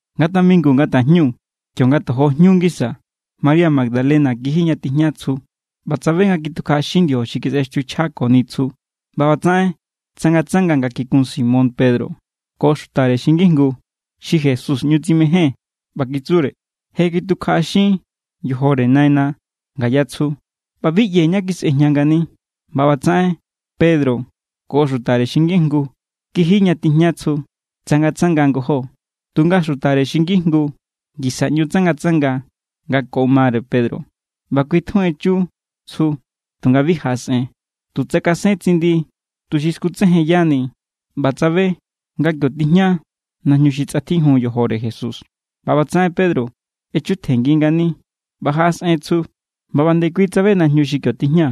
Nga tamingu nga tajñu, kionga tojo jñu ngisa, María Magdalena kiji ña tijña tsju ꞌba tsabe nga kitukjaꞌaxin ndiojo xi kisꞌextiuchjani tsju. ꞌBa ꞌbatsaꞌen tsangatsanga nga kikun Simón Pedro ko xutare xi ngijngu xi Jesús ꞌñu tsimején ꞌba kitsure: —¡Je kitukjaꞌaxin yojore naina ngaya tsju, ꞌba bi ꞌyee̱ ñá kisꞌejña ngani! ꞌBa ꞌbatsaꞌen Pedro ko xutare xi ngijngu kiji ña tijña tsju. Tsangatsanga ngojó, tunga xutare xi ngijngu ngisa ꞌñu tsangatsanga nga ko mare Pedro ꞌba kui tjun echu tsju. Tunga bi jaꞌasꞌen. Tu tsakasen tsindi tuxi skutsejenyani ꞌba tsabe nga kio tijña najñu xi tsꞌatjijun yojore Jesús. ꞌBa ꞌbatsaꞌen Pedro echutjenngi ngani ꞌba jaꞌasꞌen tsju, ꞌba ꞌba nde kui tsabe najñu xi kio tijña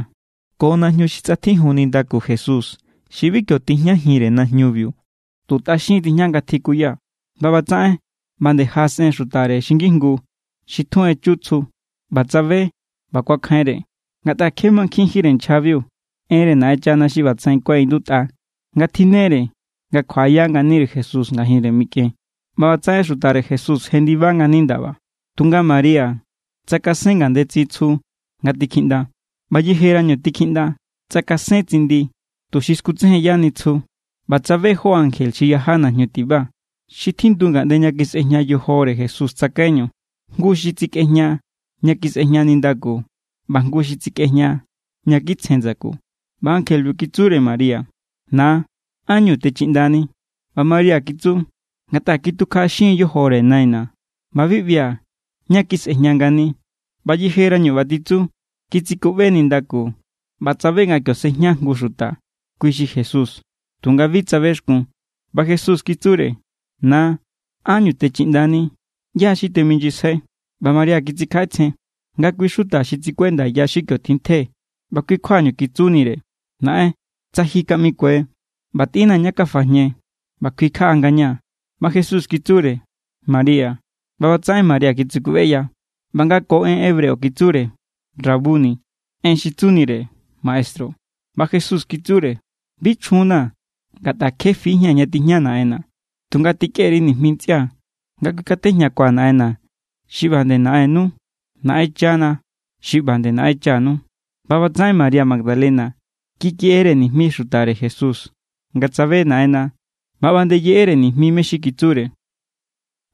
ko najñu xi tsꞌatjijun nindaku Jesús xi bi kio tijñajinre najñubiu. Tu tꞌaxin tijña nga tjikuya. ꞌBa ꞌbatsaꞌen ꞌba nde jaꞌasꞌen xutare xi ngijngu xi tjun echu tsju, ꞌba tsabe ꞌba kuakjainre. Ngatꞌa kje mankjinjínre nchjabiu enre Naꞌenchana xi ꞌbatsaꞌen kuaꞌindutꞌa nga tjinnere nga kjuaꞌaya nganire Jesús ngajinre mikꞌen. ꞌBa ꞌbatsaꞌen xutare Jesús jendiba ngani ndaba. Tunga María tsakasen ngandetsin tsju nga tikjiꞌnda. ꞌBa yejerañu tikjiꞌnda tsakasen tsindi tuxi skutsejenyani tsju ꞌba tsabe jó ankje xi yaja najñu tiba, xi tjindu ngaꞌnde ña kisꞌejña yojore Jesús tsakaiñu. Jngu xi tsikꞌejña ña kisꞌejña nindaku, ꞌba jngu xi tsikꞌejña ña kitsjen ndsaku. ꞌBa ankjelebiu kitsure María: —Na, ¿ánñu techiꞌndani? ꞌBa María kitsu: —Ngatꞌa kitukjaꞌaxin= yojore naina̱, ꞌba bi ꞌbia̱ ñá kisꞌejña ngani. ꞌBa yejerañu ꞌba titsu, kitsikuꞌbe nindaku ꞌba tsabe nga kio sejña jngu xuta. Kui xi Jesús, tunga bi tsabexkun. ꞌBa Jesús kitsure: —Na, ¿ánñu techiꞌndani? ¿ꞌYá= xi temijnyisjai? ꞌBa María kitsikjaꞌetsjen nga kui= xuta xi tsikuenda ya xi kio tjintje ꞌba kui kjuañu kitsunire: —Naꞌen, tsa ji kaꞌmikue, ꞌba tꞌinnaa̱ ñá kafajñe, ꞌba kuikjaꞌa ngañaa̱. ꞌBa Jesús kitsure: —María. ꞌBa ꞌbatsaꞌen María kitsikuꞌbeya ꞌba nga ko en hebreo kitsure: —¡Rabuni̱! (En xi tsunire: maestru.) ꞌBa Jesús kitsure: —Bi chjunnaa̱, ngatꞌa kje fijía̱n ña tijña Naꞌenna̱. Tunga tikꞌe_ri nijmi ntsꞌia̱ nga kuikatejñakua̱ Naꞌenna̱ xi ꞌba nde Naꞌennu, Naꞌenchana̱ xi ꞌba nde Naꞌenchanu. ꞌBa ꞌbatsaꞌen María Magdalena kikeꞌere nijmi xutare Jesús nga tsabe Naꞌenna ꞌba ꞌba nde yeꞌere nijmi mé= xi kitsure.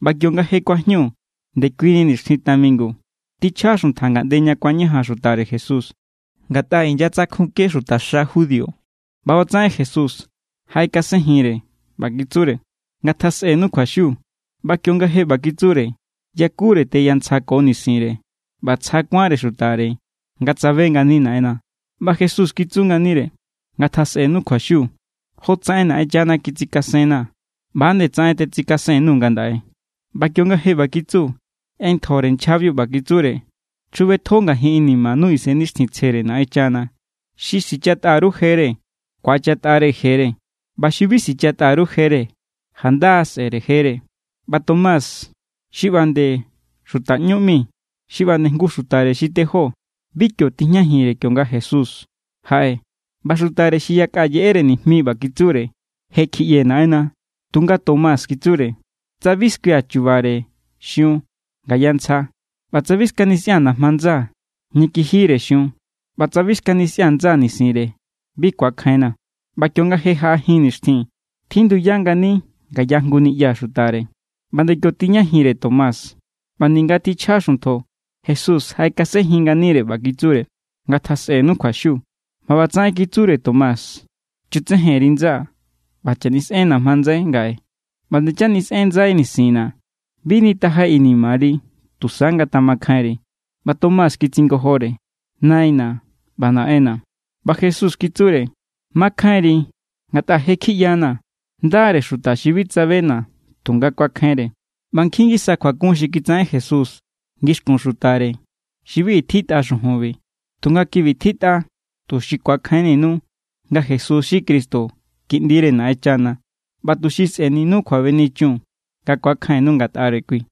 ꞌBa kionga je kuajñu ndekuini nixtjin tamingu, tjichja xuntja ngaꞌnde ña kuañajan xutare Jesús, ngatꞌa inyatsakjunke xutaxa judío. ꞌBa ꞌbatsaꞌen Jesús jaꞌekasenjinre ꞌba kitsure: —Ngatjasꞌenu kjuaxiu. ꞌBa kionga je ꞌba kitsure, yakure teyantsja ko nisinre. ꞌBa tsja kuánre xutare nga tsabe ngani Naꞌenna. ꞌBa Jesús kitsu nganire: —Ngatjasꞌenu kjuaxiu. Jotsaꞌen Naꞌenchana kitsikasenna̱, ꞌba=nde tsaꞌen tetsikasen_nuu̱ ngandaꞌe. ꞌBa kionga je ꞌba kitsu, ꞌentjore nchjabiu ꞌba kitsure: —Chjubetjo ngajin inimanu Isennixtjintsjere Naꞌenchana. Xi sichatꞌa_ru jere, ku̱achatꞌare jere. ꞌBa xi bi sichatꞌa_ru jere, janda= sꞌe̱re jere. ꞌBa Tomás xi ꞌba nde xuta ꞌñú ꞌmi, xi ꞌba nde jngu xutare xi tejó, bi kio tijñajinre kionga jaꞌe Jesús. ꞌBa xutare xi yakꞌa yeꞌere nijmi ꞌba kitsure: —Je= kjiꞌyee̱ Naꞌenna. Tunga Tomás kitsure: —Tsa bi skuia̱ chubare xiun ngaya ntsja, ꞌba tsa bi skanisꞌia̱n najma ndsaa̱ ña kijire xiun, ꞌba tsa bi skanisꞌia̱n ndsaa̱ nisinre, bi ku̱akjainna̱. ꞌBa kionga je jaꞌa jin nixtjin, tjinduya ngani ngaya jngu niꞌya xutare, ꞌba nde kio tijñajinre Tomás. ꞌBa ninga tjichja xuntjo, Jesús jaꞌekasenjin nganire ꞌba kitsure: —Ngatjasꞌenu kjuaxiu. ꞌBa ꞌbatsaꞌen kitsure Tomás: —Chutsejen_ri ndsaa̱ ꞌba chanisꞌen najma ndsai ngaꞌe. ꞌBa ndechanisꞌen ndsai nisinna̱. Bi nitajai inimari. Tusa ngatjamakjainri. ꞌBa Tomás kitsingojore: —¡Naina̱ ꞌba Naꞌenna̱! ꞌBa Jesús kitsure: —Makjainri ngatꞌa je= kjiꞌyanaa̱. Ndare xuta xi bi tsabena̱ tunga kuakjainre. ꞌBa nkjin ngisa kjuakun xi kitsaꞌen Jesús ngixkun xutare xi bi i tjitꞌa xujunbi. Tunga kibi tjitꞌa, tuxi ku̱akjainninu nga Jesús xi Cristo, Kiꞌndire Naꞌenchana, ꞌba tuxi sꞌe̱ninu kjuabenichun nga ku̱akjainnu ngatꞌare kui.